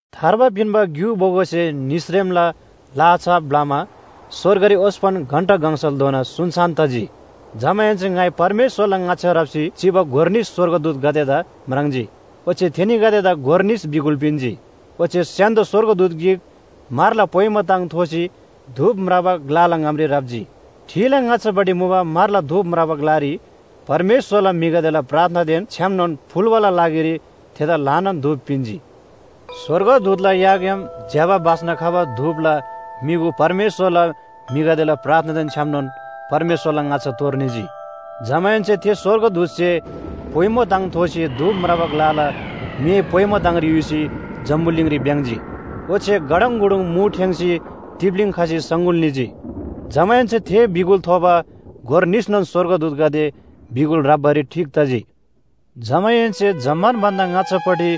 थार्बा पिन्‍बा ग्‍यु बोगोसे निसरेमला लाहा छाप ब्‍लमा स्‍वर्गरी ओस्‍पन घण्‍टा गङसलधोना सुनसान तजी। जमाहेन्‍से ङाइ परमेश्‍वरला ङाच्‍छा राप्‍सी चिबा गोर निस स्‍वर्गदूतगदेदा म्राङ्जी। ओच्‍छे थेनीगदेदा गोर निस बिगुल पिन्‍जी। ओच्‍छे स्‍य्‍हान्‍दो स्‍वर्गदूत गिक म्‍हरला पोइमो ताङ थोसी धूप म्राबा ग्‍लाला ङामरी राप्‍जी। ठिला ङाच्‍छापट्टि मुबा म्‍हरला धूप म्राबा ग्‍लारी परमेश्‍वरला म्‍हिगदेला प्रार्थनादेन छ्‌यामनोन फुल्‍बाला लागिरी थेदा ल्‍हानान धूप पिन्‍जी। स्‍वर्गदूतला याग्‍याम ज्‍यबा बास्‍ना खबा धूपला म्‍युगु परमेश्‍वरला म्‍हिगदेला प्रार्थनादेन छ्‌यामनोन परमेश्‍वरला ङाच्‍छा तोर निजी। जमाहेन्‍से थे स्‍वर्गदूतसे पोइमो ताङ थोसी धूप म्राबा ग्‍लाला मे पोइमो ताङरी युसी जम्‍बुलिङरी भ्‍याङ्‍जी। ओच्‍छे गडङगुडुङ मु ठेङ्‌सी तिप्‍लीङ खसी सङगुल निजी। जमाहेन्‍से थे बिगुल थोबा गोर निसनोन स्‍वर्गदूतगदे बिगुल ह्राप्‍बारी ठीक तजी। जमाहेन्‍से जम्‍मान भन्‍दा ङाच्‍छापट्टि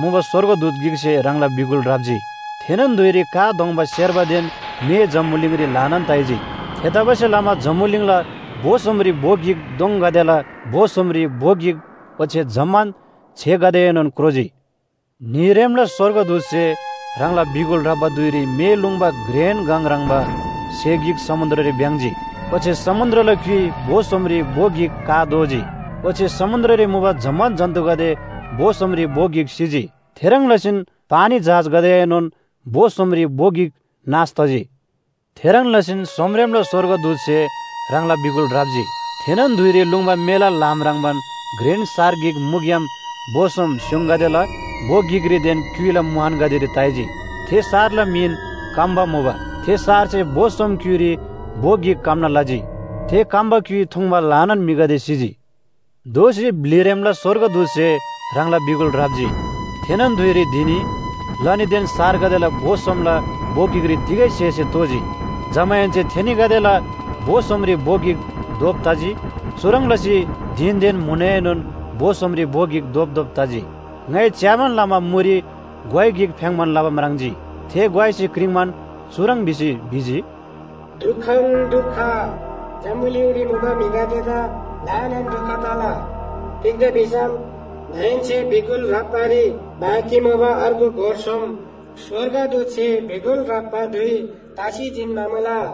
मुबा स्‍वर्गदूत गिकसे ह्राङला बिगुल ह्राप्‍जी। थेनोन धुइरी का दोङ्बा सेर्बादेन मे जम्‍बुलिङरी ल्‍हानान ताइजी। थेतबासेलमा जम्‍बुलिङला भो सोमरी भो गिक दोङगदेला भो सोमरी भो गिक ओच्‍छे जम्‍मान छेगदेएनोन क्रोजी। न्‍हीरेमला स्‍वर्गदूतसे ह्राङला बिगुल ह्राप्‍बा धुइरी मे लुङ्बा घ्रेन गङ ह्रङ्‌बा स्‍हे गिक समुन्‍द्ररी भ्‍याङ्‍जी। ओच्‍छे समुन्‍द्रला क्‍युइ भो सोमरी भो गिक का दोजी। ओच्‍छे समुन्‍द्ररी मुबा जम्‍मान जन्‍तुगदे भो सोमरी भो गिक सिजी। थेह्रङ् लसीन पानी जहाजगदेएनोन भो सोमरी भो गिक नाश तजी। थेह्रङ् लसीन सोमरेमला स्‍वर्गदूतसे ह्राङला बिगुल ह्राप्‍जी। थेनोन धुइरी लुङ्बा मेला ल्‍हाम ह्रङ्‌बान घ्रेन सार गिक मुग्‍याम भो सोम स्‍योङगदेला भो गिकरीदेन क्‍युइला मुहानगदेरी ताइजी। थे सारला मिन “कम्‍बा” मुबा। थे सारसे भो सोम क्‍युइरी भो गिक कम्‍ना लजी। थे कम्‍बा क्‍युइ थुङ्बा ल्‍हानान म्‍हिगदे सिजी। दोःसी ब्‍लिरेमला स्‍वर्गदूतसे ह्राङला बिगुल ह्राप्‍जी। थेनोन धुइरी धिनी, लनीदेन सारगदेला भो सोमला भो गिकरी तिगै स्‍हेसे तोजी। जमाहेन्‍से थेनीगदेला भो सोमरी भो गिक धोप तजी। चुह्रङ् लसी धिनदेन म्‍हुनएनोन भो सोमरी भो गिक धोपधोप तजी। ङाइ च्‍याबान लमा मुरी ग्‍वाइ गिक फ्‍याङ्‌बान लबा म्राङ्जी। थे ग्‍वाइसे क्रिङ्‌बान चुह्रङ् भिसी भिजी, “दुखन दुख, जम्‍बुलिङरी मुबा म्‍हिगदेदा ल्‍हानान दुख तला। तिग्‍दा भिसम दाहेन्‍से बिगुल ह्राप्‍बारी बाँकी मुबा अर्गु गोर सोम स्‍वर्गदूतसे बिगुल ह्राप्‍बा धुइ तसी जिन्‍बा मुला।”